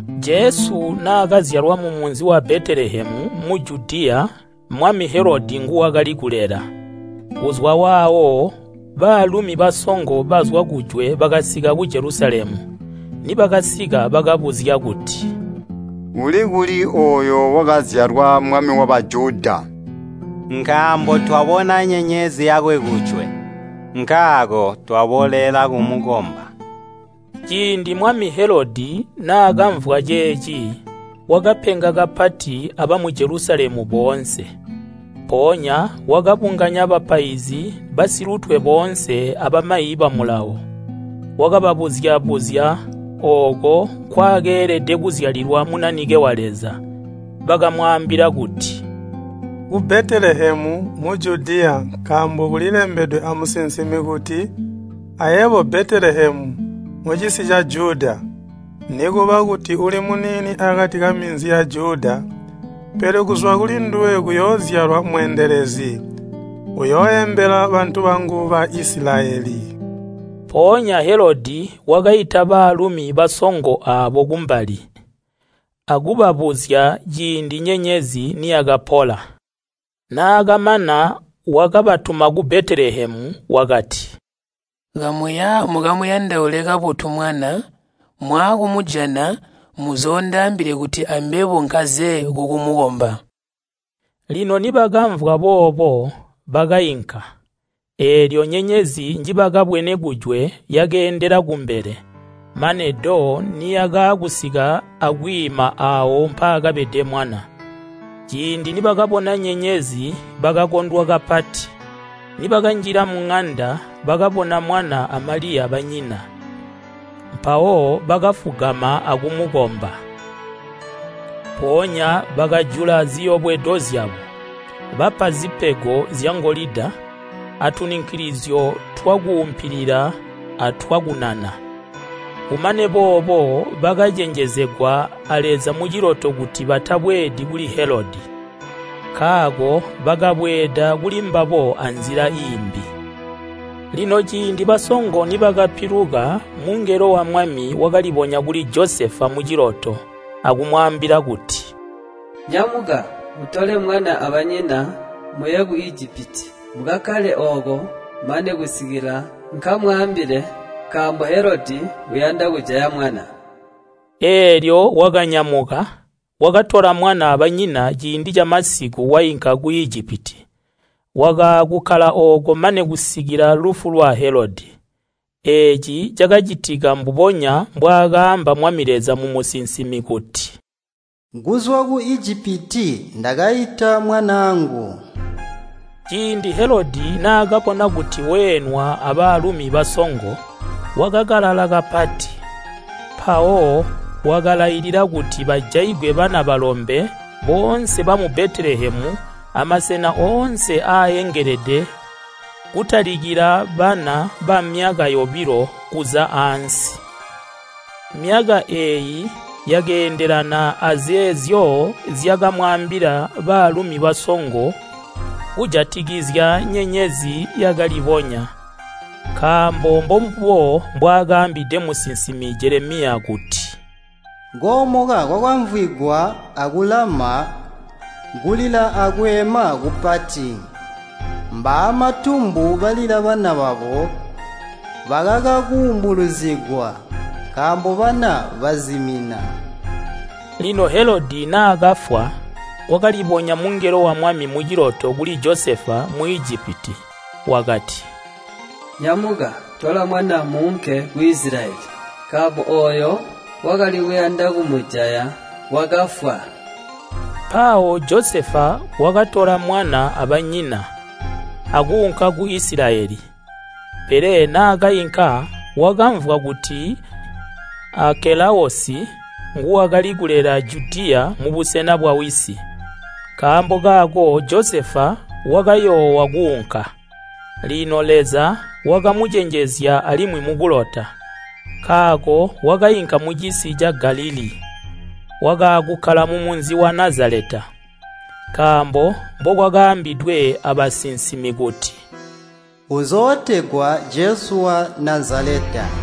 Jesu naakazyalwa mumunzi wa Betelehemu mu Judiya mwami Helodi nguwakali kulela. Kuzwa waawo baalumi basongo bazwa kujwe bakasika ku Jelusalemu. Nibakasika bakabuzya kuti, “Uli kuli ooyo wakazyalwa Mwami wa Bajuda?” Nkaambo twabona nyenyezi yakwe kujwe, nkaako twaboolela kumukomba. Ciindi mwami Helodi naakamvwa ceeci, wakapenga kapati abamu Jelusalemu boonse. Mpoonya wakabunganya bapaizi basilutwe boonse abamayi ba Mulawo, wakababuzya-buzya ooko nkwaakeelede kuzyalilwa Munanike wa Leza. Bakamwaambila kuti, “Ku Betelehemu mu Judiya nkaambo kulilembedwe amusinsimi kuti, ‘Ayebo Betelehemu mucisi ca Juda, nikuba kuti uli muniini akati kaminzi ya Juda, pele kuzwa kulinduwe kuyoozyalwa mweendelezi, uyooembela bantu bangu Baisilayeli.’” Mpoonya Helodi wakaita baalumi basongo aabo kumbali, akubabuzya ciindi nyenyezi niyakapola. Naakamana wakabatuma ku Betelehemu, wakati, “Kamuya mukamuyandaule kabotu mwana, mwaakumujana muzoondaambile kuti ambebo nkaze kukumukomba.” Lino nibakamvwa boobo, bakainka, eelyo nyenyezi njibakabwene kujwe yakeendela kumbele, mane do niyakaakusika akwiima aawo mpaakabede mwana. Ciindi nibakabona nyenyezi bakakondwa kapati. Nibakanjila muŋanda bakabona mwana a Maliya banyina, mpawo bakafugama akumukomba. Mpoonya bakajula ziyobwedo zyabo, bapa zipego zyangolida, atununkilizyo twakuumpilila atwakunana. Kumane boobo bakacenjezegwa a Leza muciloto kuti batabweedi kuli Helodi. Nkaako bakabweeda kulimbabo anzila iimbi. Lino ciindi basongo nibakapiluka mungelo wa Mwami wakalibonya kuli Josefa muciloto akumwaambila kuti, “Nyamuka, utole mwana abanyina muye ku Ijipiti. Mukakkale ooko mane kusikila nkamwaambile, nkaambo Helodi uyanda kujaya mwana.” Eelyo wakanyamuka, wakatola mwana abanyina ciindi camasiku wainka ku Ijipiti. Wakaakukkala ooko mane kusikila lufu lwa Helodi. Eeci cakacitika mbubonya mbwaakaamba Mwami Leza mumusinsimi kuti, “Kuzwa ku Ijipiti ndakaita mwanaangu.” Ciindi Helodi, naakabona kuti weenwa abaalumi basongo, wakakalala kapati, mpawo wakalailila kuti bajaigwe bana balombe boonse bamu Betelehemu amasena oonse aaengelede kutalikila bana bamyaka yobilo kuza aansi. Myaka eeyi yakeendelana azeezyo zyakamwaambila baalumi basongo kujatikizya nyenyezi yakalibonya. Nkaambo mbombubo mbwaakaambide musinsimi Jelemiya kuti, “Koomoka kwakamvwigwa aku Lama, kulila akweema kupati. Mbaamatumbu balila bana babo bakaka kuumbulizigwa, nkaambo bana bazimina.” Lino Helodi naakafwa, kwakalibonya mungelo wa Mwami muciloto kuli Josefa mu Ijipiti wakati, “Nyamuka, tola mwana muunke ku Isilayeli, nkaambo ooyo wakali kuyanda kumujaya wakafwa.” Mpawo Josefa wakatola mwana abanyina, akuunka ku Isilayeli. Pele naakainka wakamvwa kuti Aakelawosi nguwakali kulela Judiya mubusena bwawisi. Nkaambo kaako Josefa wakayoowa kuunka. Lino Leza wakamucenjezya alimwi mukulota, nkaako wakainka mucisi ca Galilii. Wakaakukkala mumunzi wa Nazaleta, nkaambo mbokwakaambidwe abasinsimi kuti, “Uzootegwa Jesu wa Nazaleta.”